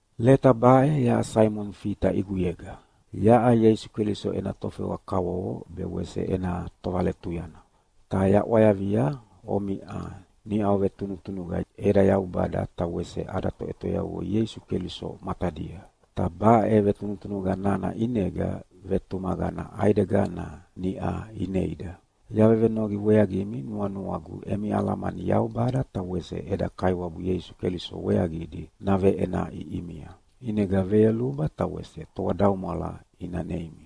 Leta baʼe yaʼa Saimoni Fita ʼiguyega, yaʼa Ieisu Keliso ena tofewa kavovo be wese ena tovaletuyana. Ta yaʼwayavia omiʼa niʼa ovetunutunuqa eda Yaubada ta wese ada Toʼetoyavua Ieisu Keliso matadia. Ta baʼe vetunutunuqa nana ʼinega vetumaqana ʼaidegana niʼa ineida. Yavevenoqi weaqimi nuanuagu emi alamani Yaubada ta wese eda Kaiwabu Ieisu Keliso weaqidi naveʼenaʼi ʼimia, ʼinega veyoluba ta wese toadaumwala ina neimi.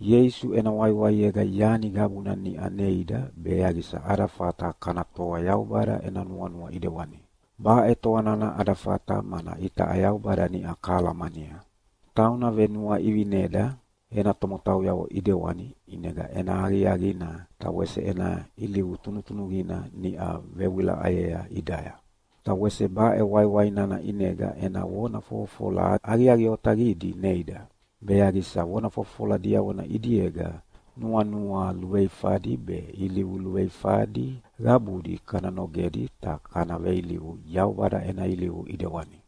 Ieisu ena waiwaiega yani qabuna niʼa neida be yaqisa ada fata kana toa Yaubada ena nuanua ʼidewani. Baʼe toa nana ada fata mana itaʼa Yaubada niʼa kahalamania. Tauna venuaʼivineda ena tomotauyavo ʼidewani ʼinega ena aqiaqina ta wese ena ilivu tunutunuqina niʼa vewilaʼayea ʼidaya. Ta wese baʼe waiwai nana ʼinega ena vona fofofola aqiaqi otaqidi neida, be yaqisa vona fofofola diavona ʼidiega nuanua luveifadi be ilivu luveifadi qabudi kana nogedi ta kana veilivu Yaubada ena ilivu ʼidewani.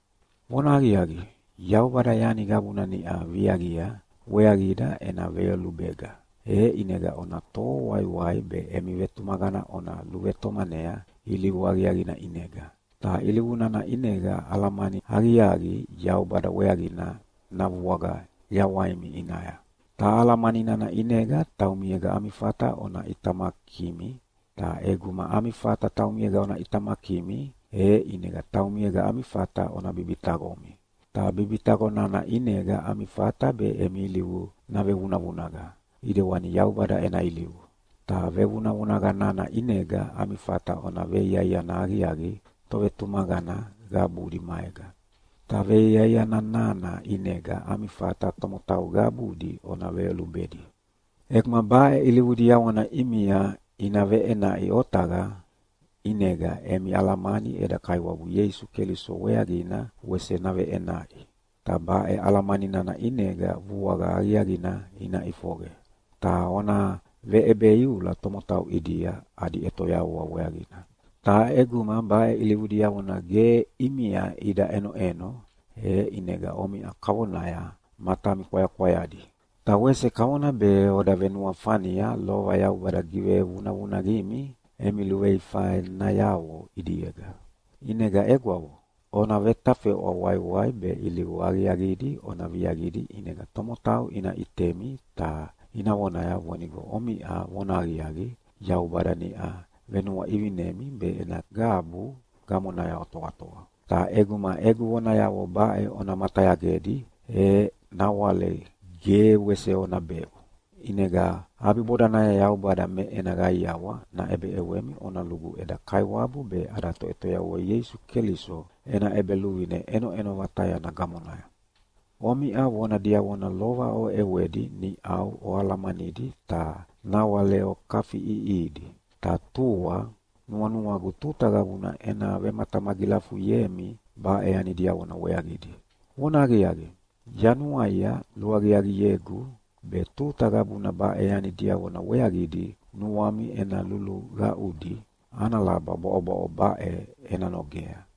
Vonahaqiaqi, Yaubada yani qabuna niʼa viaqia weaqida ena veyolubega, e ʼinega ona toho waiwai be emi vetumaqana ona luvetomanea ilivu aqiaqina ʼinega, ta ilivu nana ʼinega alamani aqiaqi Yaubada weaqina navuaqa yawaimi ʼinaya, ta alamani nana ʼinega taumiega ami fata ona ʼitamakimi, ta ʼeguma ami fata taumiega ona ʼitamakimi, e ʼinega taumiega ami fata ona bibitaqomi, ta bibitaqo nana ʼinega ami fata be emi ilivu navevunavunaqa ʼidewani Yaubada ena ilivu, ta vevunavunaqa nana ʼinega ami fata ona veiaiana aqiaqi tovetumaqana qabudi maega, ta veiaiana nana ʼinega ami fata tomotau qabudi ona veyolubedi. ʼEguma baʼe ilivu diavona ʼimia ina veʼenaʼi otaqa, ʼinega emi alamani eda Kaiwabu Ieisu Keliso weaqina wese naveʼenaʼi, ta baʼe alamani nana ʼinega vuaqa aqiaqina ina ʼifoqe, ta ona veʼebeiula tomotau ʼidia adi ʼetoyavua weaqina. Ta ʼeguma baʼe ilivu diavona ge ʼimia ida ʼenoʼeno, e ʼinega omiʼa kavonaya matami kwayakwayadi, ta wese kavona be oda venuafania lova Yaubada givevunavunaqimi emi luveifanayavo ʼidiega. ʼInega egwavo, ona vetafeʼwa waiwai be ilivu aqiaqidi ona viaqidi ʼinega tomotau ina ʼitemi ta ina vonaya vonigo omiʼa vonahaqiaqi Yaubada niʼa venuaʼivinemi be ena qabu gamonaya otoatoa. Ta ʼeguma egu vonayavo baʼe ona matayagedi e nawale ge wese ona beʼu. ʼInega ʼabibodanaya Yaubada me ena qaiawa naʼebeʼewemi ona lugu eda Kaiwabu be ada Toʼetoyavua Ieisu Keliso ena ʼEbeluvine ʼenoʼeno vatayana gamonaya. Omiʼa vona diavona lova oʼewedi niʼau oalahalamanidi ta nawale okafiʼiʼihidi, ta tua nuanuagu tuta qabuna ena vematamagilafuyemi baʼe yani diavona weaqidi. Vonahaqiaqi, yanuaia luaqiaqiegu be tuta qabuna baʼe yani diavona weaqidi nuami ena luluqaʼudi ana laba bwaʼobwaʼo baʼe ena nogea,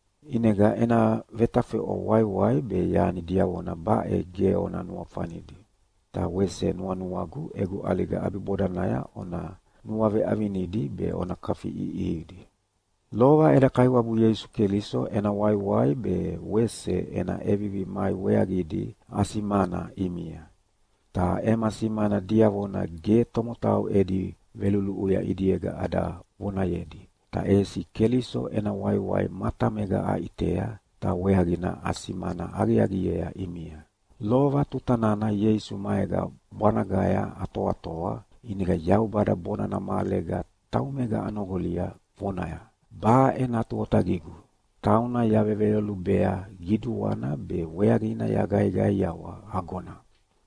ʼInega ena vetafeʼwa waiwai be yani diavona baʼe ge ona nuafanidi, ta wese nuanuagu egu ʼaliga ʼabibodanaya ona nuaveʼavinidi be ona kafiʼiʼihidi. Lova eda Kaiwabu Ieisu Keliso ena waiwai be wese ena ʼevivi mai weaqidi asimana ʼimia. Ta ema simana diavona ge tomotau edi veluluʼuya ʼidiega ada vonayedi, ta ʼesi Keliso ena waiwai matamega aʼitea, ta weaqina asimana aqiaqiea ʼimia. Lova tuta nana Ieisu maega bwanagaya atoatoa, ʼinega Yaubada bonana mahalega taumega anoqolia, vonaya, “Baʼe Natu Otaqigu, tauna yaveveyolubea qiduana be weaqina yaqaiqaiawa agona.”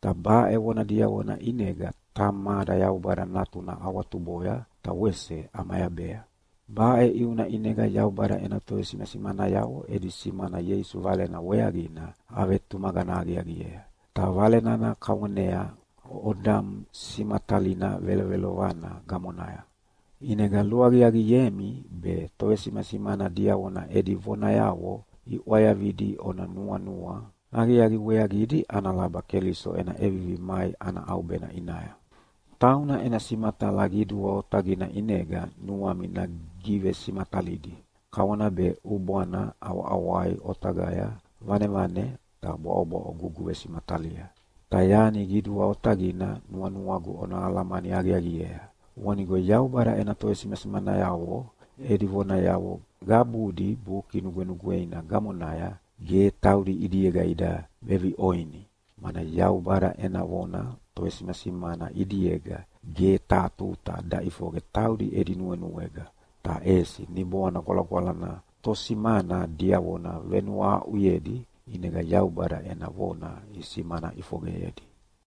Ta baʼe vona diavona ʼinega Tamada Yaubada Natuna awatuboya ta wese ʼamayabea. Baʼe ʼiuna ʼinega Yaubada ena tovesimasimanayavo edi simana Ieisu Valena weaqina avetumaqana aqiaqiea. Ta Vale nana kavonea odamu simatalina velovelovana gamonaya. ʼInega luaqiaqiemi be tovesimasimana diavona edi vonayavo iʼwayavidi ona nuanua aqiaqi weaqidi ana laba Keliso ena ʼevivi mai ana ʼaubena ʼinaya. Tauna ena simatala qidua otaqina ʼinega nuami nagivesimatalidi kavona be ʼubwana ʼawaʼawai otaqaya vanevane ta bwaʼobwaʼo guguvesimatalia. Ta yani qidua otaqina nuanuagu ona alamani aqiaqiea, vonigo Yaubada ena tovesimasimanayavo edi vonayavo qabudi Buki Nugwenugweina gamonaya, ge taudi ʼidiega ida veviʼoni, mana Yaubada ena vona tovesimasimana ʼidiega ge taha tuta daʼifoqe taudi edi nuenuega, ta ʼesi Niboana Gwalagwalana tosimana diavona venuahaʼuyedi ʼinega Yaubada ena vona isimana ʼifoqeyedi.